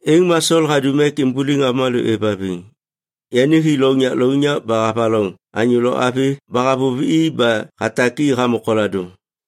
Êŋ ma Sol hadum ek imbuliŋ avômalô êvhaviŋ. Yani hi lounyak lounyak ba havaloŋ anyô lo avi ba havôv i ba hatak i hamô koladôŋ.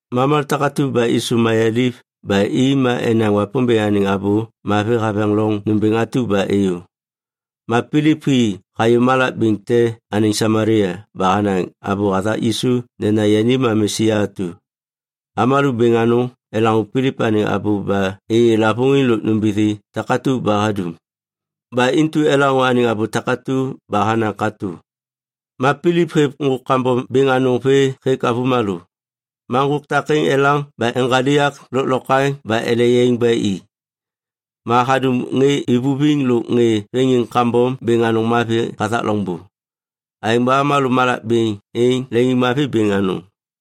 Ma avômalô takatu ba êsôv mayaliv ba i ma enaŋ Wapômbêŋ anêŋ Abô Mavi haveŋ loŋ nômbêŋ atu ba êyô. Ma Pilip hi hayô malak bêŋ te anêŋ Samalia ba hanaŋ abô hathak Yisu nena yani ma Mesia atu. Avômalô bêŋ anôŋ elaŋô Pilip anêŋ abô ba êyê lavôŋiŋ lôk nômbithi takatu ba hadum, ba intu elaŋô anêŋ abô takatu ba hanaŋ katô. Ma Pilip hêv ŋgôk kambom bêŋ anôŋ vê hêk avômalô, ma ŋgôk takêŋ elaŋ ba eŋgaliak lôklokwaŋ ba ele yaiŋ ba i. Ma hadum ŋê ivuviŋ lôk ŋê veŋiŋ kambom bêŋ anôŋ mavi hathak loŋbô. Aêŋ ba avômalô malak bêŋ êŋ leŋiŋmavi bêŋ anôŋ.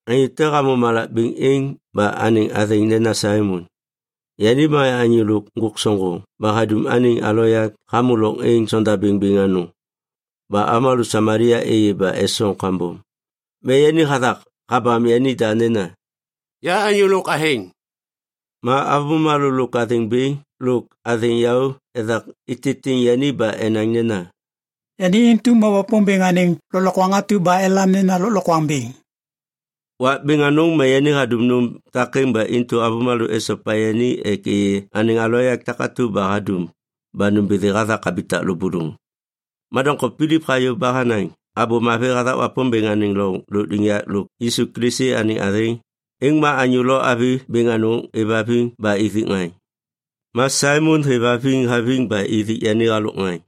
Anyô te hamô malak bêŋ êŋ ba anêŋ athêŋ nena Saimon. Yani ma anyô lôk ŋgôk soŋgoŋ ba hadum anêŋ aloyak hamô loŋ êŋ sondabêŋ bêŋ anôŋ ba avômalô Samalia êyê ba esoŋ kambom. Ma yani hathak habam yanida nena, “Ya anyô lôk athêŋ.” Ma avômalô lôk athêŋ bêŋ lôk athêŋ yaô ethak ititiŋ yani ba enaŋ nena, “Yani intu ma Wapômbêŋ anêŋ lôklokwaŋ atu ba elam nena Lôklokwaŋ Bêŋ.” Wak bêŋ anôŋ ma yani hadum nôm takêŋ ba intu avômalô esopa yani ek êyê anêŋ aloyak takatu ba hadum ba nômbithi hathak habitak lôbôlôŋ. Ma doŋtom Pilip hayô ba hanaŋ Abô Mavi hathak Wapômbêŋ anêŋ loŋ lôkliŋyak lôk Yisu Kilisi anêŋ athêŋ. Êŋ ma anyô lo avi bêŋ anôŋ êvhaviŋ ba ithik ŋaŋ. Ma Saimon hêvhaviŋ haviŋ ba ithik yani halôk ŋaŋ.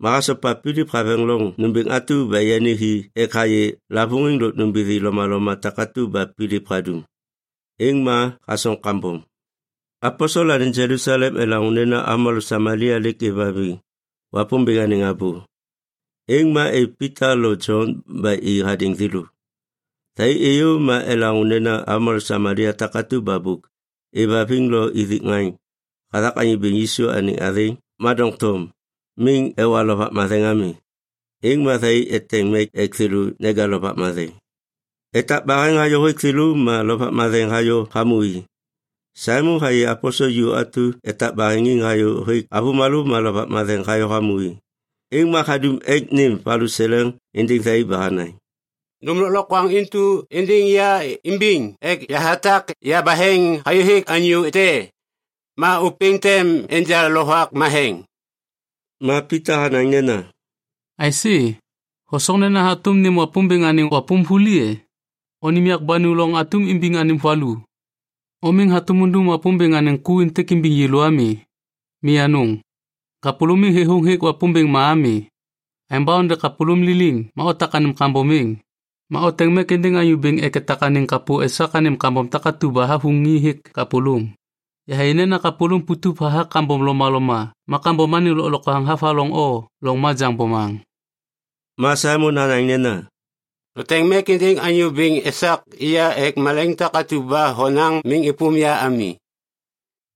Ma hasopa Pilip haveŋ loŋ nômbêŋ atu ba yani hi ek hayê lavôŋiŋ lôk nômbithi lomaloma takatu ba Pilip hadum. Êŋ ma hasoŋ kambom. Aposel anêŋ Jelusalem elaŋô nena avômalô Samalia lêk êvhaviŋ Wapômbêŋ anêŋ abô. Êŋ ma êv Pita lo Jon ba i hadêŋ thêlô. Thai êyô ma elaŋô nena avômalô Samalia takatu ba bôk êvhaviŋ lo ithik ŋaŋ hathak Anyô Bêŋ Yisu anêŋ athêŋ, ma doŋtom miŋ ewa Lovak Matheŋ ami. Êŋ ma thai eteŋ mek ek thêlô neja Lovak Matheŋ. Etak baheŋ hayô hêk thêlô, ma Lovak Matheŋ hayô hamô i. Saimon hayê aposel ju atu etak baheŋiŋ hayô hêk avômalô ma Lovak Matheŋ hayô hamô i. Êŋ ma hadum ek nêm valuseleŋ êndêŋ thai ba hanaŋ, “Nônêm lôklokwaŋ intu êndêŋ ya imbiŋ ek yahatak yabaheŋ hayô hêk anyô te, ma ôpêŋ tem enja Lovak Matheŋ.” Ma Pita hanaŋ nena, “Aisê? Hosoŋ nena hatôm nêm Wapômbêŋ anêŋ wapôm vuli e? O nêm yak ba nu loŋ atum imbiŋ anêm valu! O miŋ hatôm undum Wapômbêŋ anêŋ ku êntêk imbiŋ yêlô ami. Mi anôŋ! Kapôlôm miŋ thêthôŋ hêk Wapômbêŋ ma ami. Aêŋ ba onde kapôlôm liliŋ ma otak anêm kambom êŋ. Ma oteŋ mek êndêŋ Anyô Bêŋ ek etak anêŋ kapô esak anêm kambom takatu ba havuŋi hêk kapôlôm. Yahayê nena kapôlôm putup hathak kambom lomaloma ma kambom anêŋ lôklokwaŋ havaloŋ o loŋ majaŋ bomaŋ.” Ma Saimon hanaŋ nena, “Noteŋ mek êndêŋ Anyô Bêŋ esak ya ek malaiŋ takatu ba honaŋ miŋ êpôm ya ami.”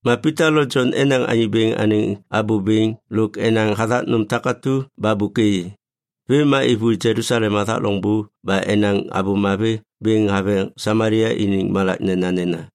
Ma Pita lo Jon enaŋ Anyô Bêŋ anêŋ abô bêŋ lôk enaŋ hathak nôm takatu ba bôk êyê. Vêm ma êvôi Jelusalem hathak loŋbô ba enaŋ Abô Mavi bêŋ haveŋ Samalia iniŋ malak nenanena.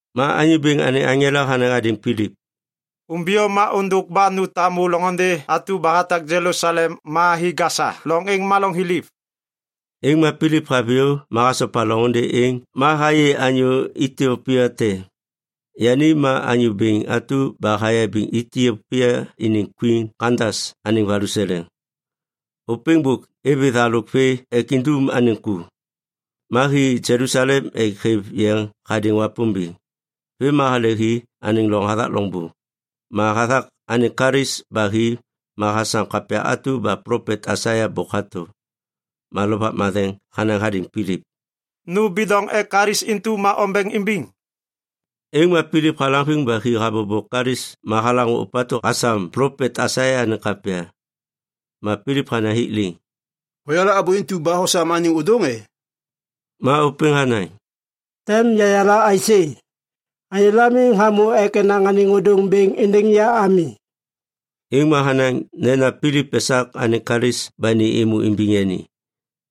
Ma Anyô Bêŋ anêŋ aŋela hanaŋ hadêŋ Pilip, “Umbiyô ma ôndôk ba nu tamu loŋôndê atu ba hatak Jelusalem ma hi Gasa, loŋ êŋ ma loŋ thiliv.” Êŋ ma Pilip haviyô ma hasopa loŋôndê êŋ ma hayê anyô Itiopia te, yani ma anyô bêŋ atu ba hayabiŋ Itiopia iniŋ kwin Kandas anêŋ valuseleŋ. Ôpêŋ bôk êvê thalôk vê ek indum anêŋ ku. Ma hi Jelusalem ek hêv yeŋ hadêŋ Wapômbêŋ. Vêm ma hale hi anêŋ loŋ hathak loŋbô. Ma hathak anêŋ kalis ba hi ma hasam kapya atu ba plopet Aisaia bôk hato. Ma Lovak Matheŋ hanaŋ hadêŋ Pilip, “Nu bidoŋ ek kalis intu ma ombeŋ imbiŋ.” Êŋ ma Pilip halaŋviŋ ba hi habobo kalis ma halaŋô ôpatu hasam plopet Aisaia anêŋ kapya. Ma Pilip hanaŋ hik liŋ, “Hoyala abô intu ba hosam anêŋ ôdôŋ e?” Ma ôpêŋ hanaŋ, “Tem yayala aisê? Anyôla miŋ hamô ek enaŋ anêŋ ôdôŋ bêŋ êndêŋ ya ami.” Êŋ ma hanaŋ nena Pilip esak anêŋ kalis ba ni êmô imbiŋ yani.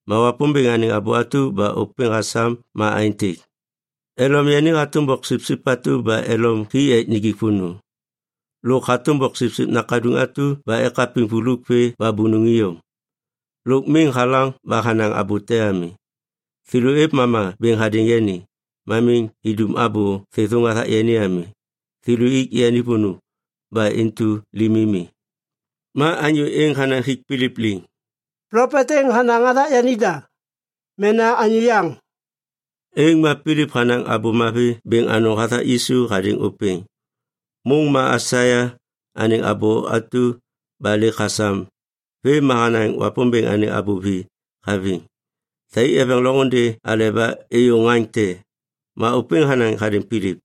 Ma Wapômbêŋ anêŋ abô atu ba ôpêŋ hasam ma aêntêk, “Elom yani hatôm boksipsip atu ba elom hi ek nijik vônô. Lôk hatôm boksipsip nakaduŋ atu ba ekapiŋ vuluk vê ba bônôŋ iyom, lôk miŋ halaŋ ba hanaŋ abô te ami. Thêlô êv mama bêŋ hadêŋ yani, ma miŋ idum abô thêthôŋ hathak yani ami. Thêlô ik yani vônô, ba intu limi mi.” Ma anyô êŋ hanaŋ hik Pilip liŋ, “Plopet êŋ hanaŋ hathak yanida, mena anyô yaŋ?” Êŋ ma Pilip hanaŋ Abô Mavi bêŋ anôŋ hathak Yisu hadêŋ ôpêŋ, môŋ ma Aisaia anêŋ abô atu ba lêk hasam vêm ma hanaŋ Wapômbêŋ anêŋ abô vi haviŋ. Thai eveŋ loŋôndê aleba êyô ŋaŋ te, ma ôpêŋ hanaŋ hadêŋ Pilip,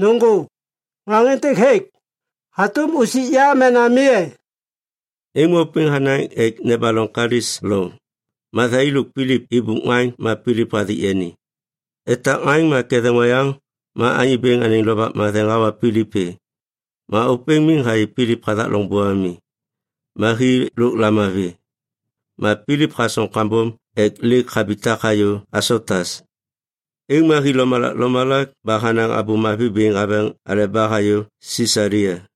“Nôŋgô, ŋaŋ êntêk hêk. Hatôm usik ya mena mi e?” Êŋ ma ôpêŋ hanaŋ ek nebaloŋ kalis loŋ. Ma thai lôk Pilip ibup ŋaŋ ma Pilip hathik yani. Etak ŋaŋ ma ketheŋ oyaŋ ma Anyô Bêŋ anêŋ Lovak Matheŋ hawa Pilip vê. Ma ôpêŋ miŋ hayê Pilip hathak loŋbô ami. Ma hi lôk lamavi. Ma Pilip hasoŋ kambom ek lêk habitak hayô Asotas. Êŋ ma hi lomalak lomalak ba hanaŋ Abô Mavi bêŋ haveŋ aleba hayô Sisalia.